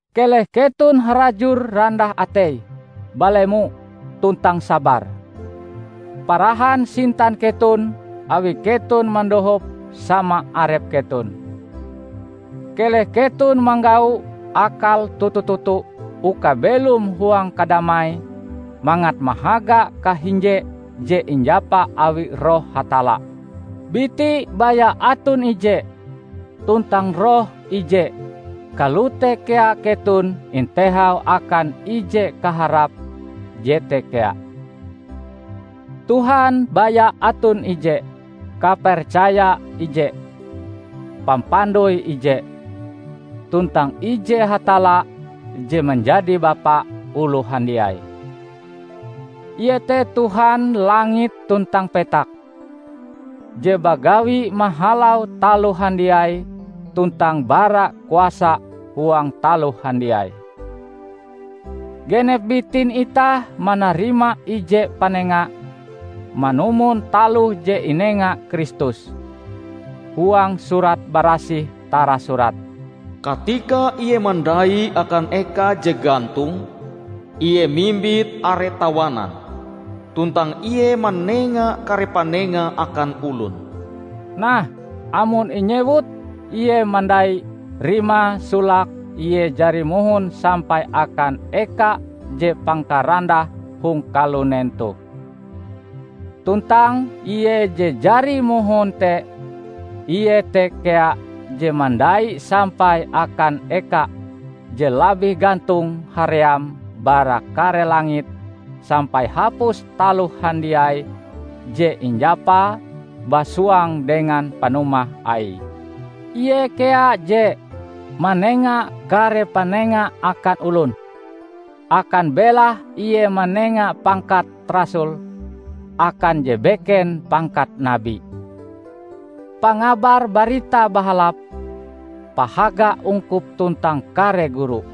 Keleh keton harajur randah atei, balemo, tuntang sabar. Parahan sintan keton awi keton mandohop sama arep keton. Keleh keton manggau akal toto-toto uka belom huang kadamai mangat mahaga kahinje je injapa awi Roh Hatalla. Biti baya aton ije, tuntang Roh ije. Kalote kea keton intehau akan ije kaharap jete kea. Tuhan baya aton ije, kapercaya ije, pampandoi ije, tuntang ije Hatalla je manjadi Bapa oloh handiai. Ie te Tuhan langit tuntang petak, je bagawi mahalau taloh handiai tuntang bara kuasa huang taloh handiai. Genep bitin itah manarima ije panenga manumon taloh je inenga Kristus. Huang Surat Barasih tarasurat, "Katika Ie mandai akan eka je gantong, Ie mimbit are tawanan; tuntang Ie manenga kare panenga akan olon." Nah, amon inyewut "Ie mandai" rimae solake Ie jari mohon sampai akan eka je pangkarandahe hong kalunen toh. Tuntang Ie je jari mohon te, Ie te kea je mandai sampai akan eka je labih gantong haream bara kare langit sampai hapus taloh handiai je injapae basuang dengan panumah Aie. Ie kea je "manenga kare panenga akan olon"; akan belahe Ie manenga pangkat rasul, akan je beken pangkat nabi, pangabar Barita Bahalap, pahaga ungkup tuntang kare guru.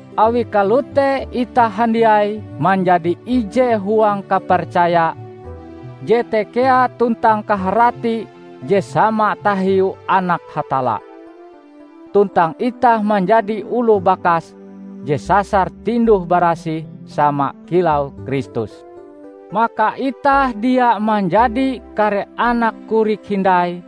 Awi kalote itah handiai manjadi ije huang kapercaya jete kea tuntang kaharati je sama tahiu Anak Hatalla. Tuntang itah manjadi oloh bakas je sasar tinduh-barasih sama kilau Kristus. Maka itah dia manjadi kare anak korik hindai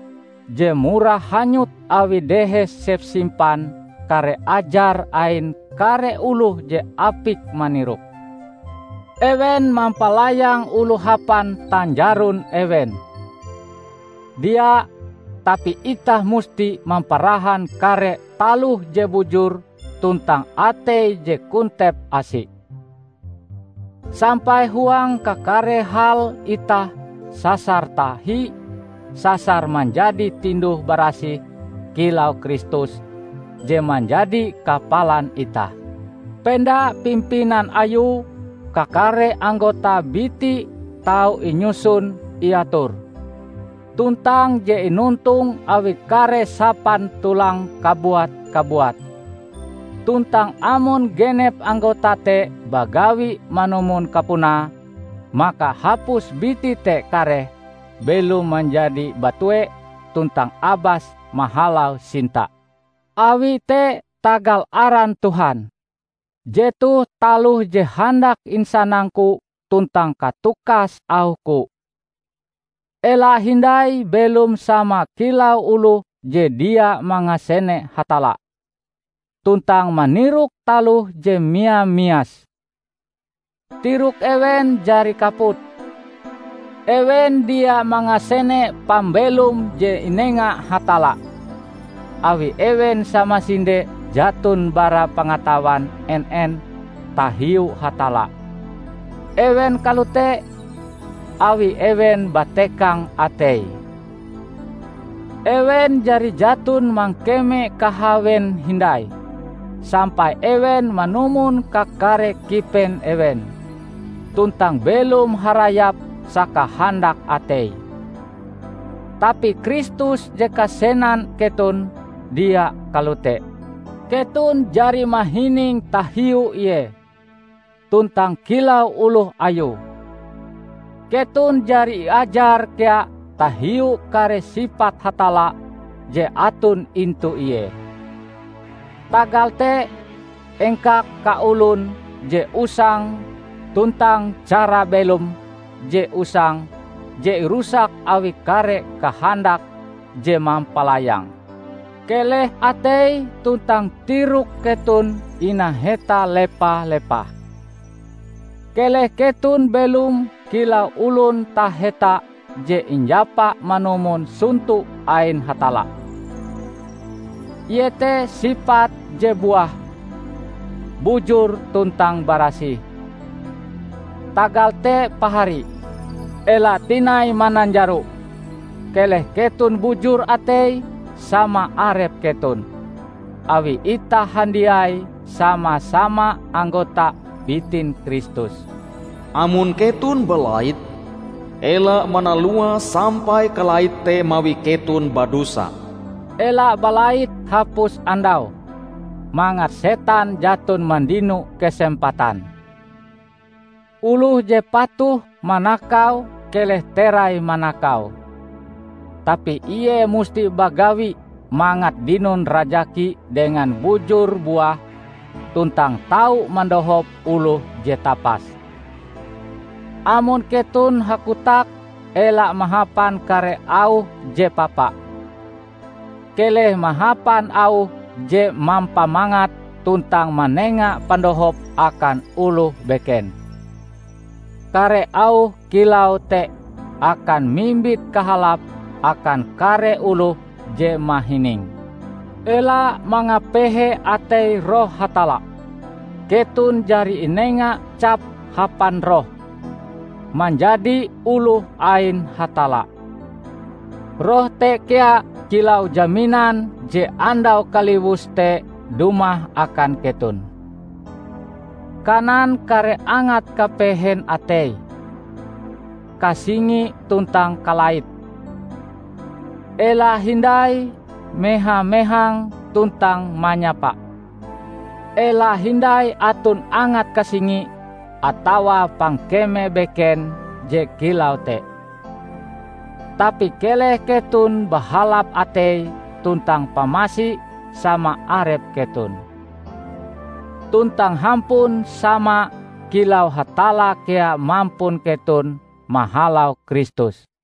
je murah hanyut awi dehes sepsimpan kare ajar ain kare oloh je apik manirok. Ewen mampalayang oloh hapan tanjaron ewen. Dia! Tapi itah musti mamparahan kare taloh je bujur tuntang atei je kontep asi, sampai huang kakare hal itah sasar tahi sasar manjadi tinduh-barasih kilau Kristus, je manjadi kapalan itah. Penda pimpinan Ayue, kakare anggota biti tau inyusun-iator, tuntang je inontong awi kare sapan tulang kabuat-kabuat. Tuntang amon genep anggota te bagawi manumon kapunae, maka hapus biti te kareh belom manjadi batue tuntang abas mahalau sinta. Awi te tagal aran Tuhan, jetoh taloh je handak insanangku tuntang katukas auhku: ela hindai belom sama kilau oloh je dia mangasene Hatalla, tuntang manirok taloh je mia-mias. Tirok ewen jari kaput. Ewen dia mangasene pambelom je inenga Hatalla, awi ewen samasinde jaton bara pangatawan en-en tahiu Hatalla. Ewen kalote, awi ewen batekang ateie. Ewen jari jaton mangkeme kahawen hindai, sampai ewen manumon kakare kipen ewen, tuntang belom harayap sakahandak ateie. Tapi Kristus je kasenan keton, dia kalote! Keton jari mahining tahiu Ie! Tuntang kilau oloh Ayue, keton jari iajar kea tahiu kare sipat Hatalla je aton intu Ie! Tagal te engkak kaolon je usang tuntang cara belom je usang je irusak awi kare kahandak je mampalayang. Keleh atei tuntang tirok keton inaheta lepa-lepah. Keleh keton belom kilau olon taheta je injapa manumon sonto ain Hatalla; iete sipat je buah, bujur tuntang barasih. Tagal te pahari, ela tinai mananjaro. Keleh keton bujur atei sama arep keton, awi itah handiai sama-sama anggota bitin Kristus. Amon keton balait, ela manaluae sampai kalait te mawi keton badosa. Ela balait hapus andau, mangat setan jaton mandino kesempatan. Oloh je patuh manakau keleh terai manakau. Tapi ie musti bagawi mangat dinon rajaki dengan bujur-buah tuntang tau mandohop oloh je tapas. Amon keton hakotak ela mahapan kare auh je papa. Keleh mahapan auh je mampamangat tuntang manenga pandohop akan oloh beken. Kare auh kilau te akan mimbit kahalap akan kare oloh je mahininge. Ela mangapehe atei Roh Hatalla. Keton jari inenga cap hapan Roh, manjadi oloh ain Hatalla. Roh te kea kilau jaminan je Andau Kaliwus te dumah akan keton. Kanan kare angat kapehen atei, kasingi tuntang kalait. Ela hindai meha-mehang tuntang manyapa. Ela hindai aton angat kasingi atawa pangkeme beken je kilau te. Tapi keleh keton bahalap atei tuntang pamasi sama arep keton, tuntang hampun sama kilau Hatalla kea mampun keton mahalau Kristus.